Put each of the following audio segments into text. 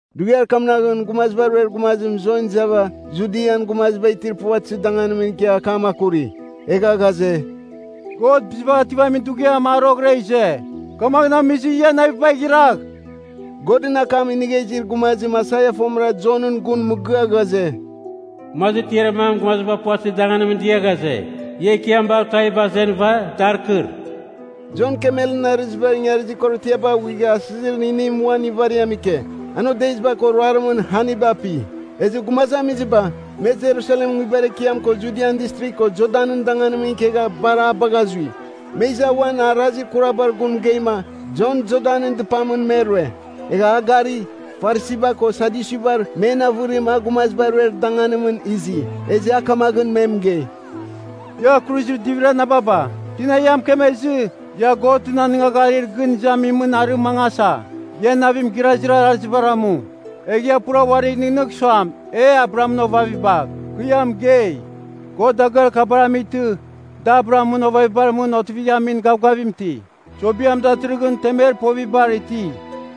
Dughiar kamnaghɨn Gumaziba Ruer Gumazim Jon izava, Judian gumaziba itir puvatɨzir danganimɨn ikia akam akuri. Egha ghaze, “God Bizibagh Ativamin Dughiam, a roghɨra ize. Kamaghɨn amizɨ, ia navibagh iragh.” Godɨn akam inigha izir gumazim Aisaia fomɨra Jonɨn gun mɨgɨa ghaze, “Gumazir tiarir mam gumaziba puvatɨzir danganimɨn dia ghaze, ‘Ia Ekiam baghɨva tuaviba azenɨva, dar kɨr.’” Jon kemelɨn arɨziba ingarizir korotiaba aghuigha asɨzir inim uan ivariam ike. An odeziba ko ruarimɨn haniba api. Ezɨ gumazamiziba, me Jerusalemɨn nguibar ekiam ko Judian Distrigh ko Jordanɨn danganimɨn ikegha, bar a bagha zui. Me iza uan arazir kurabar gun mɨgeima, Jon Jordan dɨpamɨn me rue. Egha a gari, Farisiba ko Sadyusibar men avɨrim a gumaziba ruer danganimɨn izi. Ezɨ a kamaghɨn me mɨgei, “Ia kuruzir divir anababa, tina ia mɨkemezɨ, ia Godɨn anɨngagharir gɨn izamimɨn arɨ mangasa? Ia navim gɨrazir arazibar amu. Egh ia pura uarigh nɨghnɨgh suam ‘E Abrahamɨn ovaviba.’ Kɨ ia mɨgei, God dagɨar kabara amightɨ da Abrahamɨn ovavibar mɨn otivighamin gavgavim iti. Sobiam datɨrɨghɨn temer povibar iti,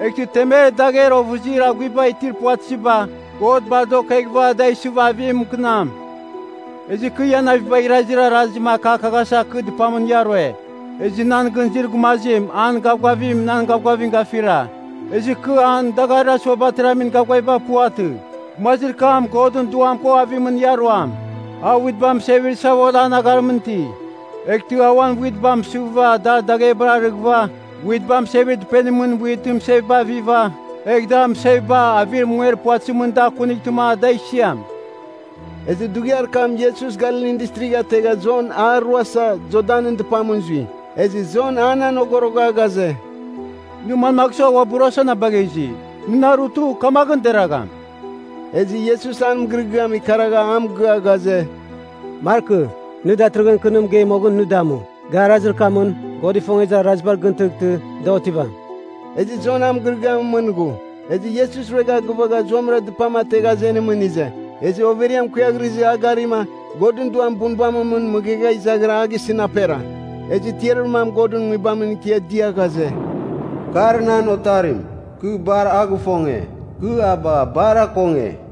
eghtɨ temer dagher ovɨzir aghuiba itir puvatɨziba, God bar da okeghɨva da isɨva avim mɨkɨnam. “Ezɨ kɨ ia navibagh irazir arazim akakaghasa kɨ dɨpamɨn ia rue. Ezɨ nan gɨn izir gumazim, an gavgavim nan gavgavim gafira. Ezɨ kɨ an dagarir asuabar ateramin gavgaviba puvatɨ. Gumazir kam Godɨn Duam ko avimɨn ia ruam. A witba mɨsevir savol an agharimɨn iti, eghtɨ a uan witba mɨsɨva dar daghebar arɨghɨva, witba mɨsevir dɨpenimɨn witɨn mɨseviba aviva, egh dar mɨseviba avir munger puvatɨzimɨn da akuntɨma, da isiam.” Ezɨ dughiar kam Iesus Galilin Distrigh ategha Jon a ruasa, Jordanɨn dɨpamɨn zui. Ezɨ Jon an anogorogha ghaze, “Nɨ manmagh sua, uabɨ ruasa na bagha izi? Nɨ na rutɨ, kamaghɨn deragham!” Ezɨ Iesus an mɨgɨrɨgɨam ikaragha a mɨgɨa ghaze, “Markɨ. Nɨ datɨrɨghɨn kɨ nɨ mɨgei moghɨn nɨ damu. Ga arazir kamɨn, God ifongezir araziba dar gɨn tɨghtɨ, da otɨvam.” Ezɨ Jon an mɨgɨrɨgɨamɨn mɨn ghu. Ezɨ Iesus ruegha gɨvagha zuamɨra dɨpam ategha azenimɨn ize. Ezɨ overiam kuiaghrɨzɨ a garima, Godɨn Duam bunbamɨn mɨn mɨghegha izaghira a gisɨn apera. Ezɨ tiarir mam Godɨn Nguibamɨn ikia dɨa ghaze, “Kar nan Otarim, kɨ bar a gifonge. Kɨ a bagha bar akonge.”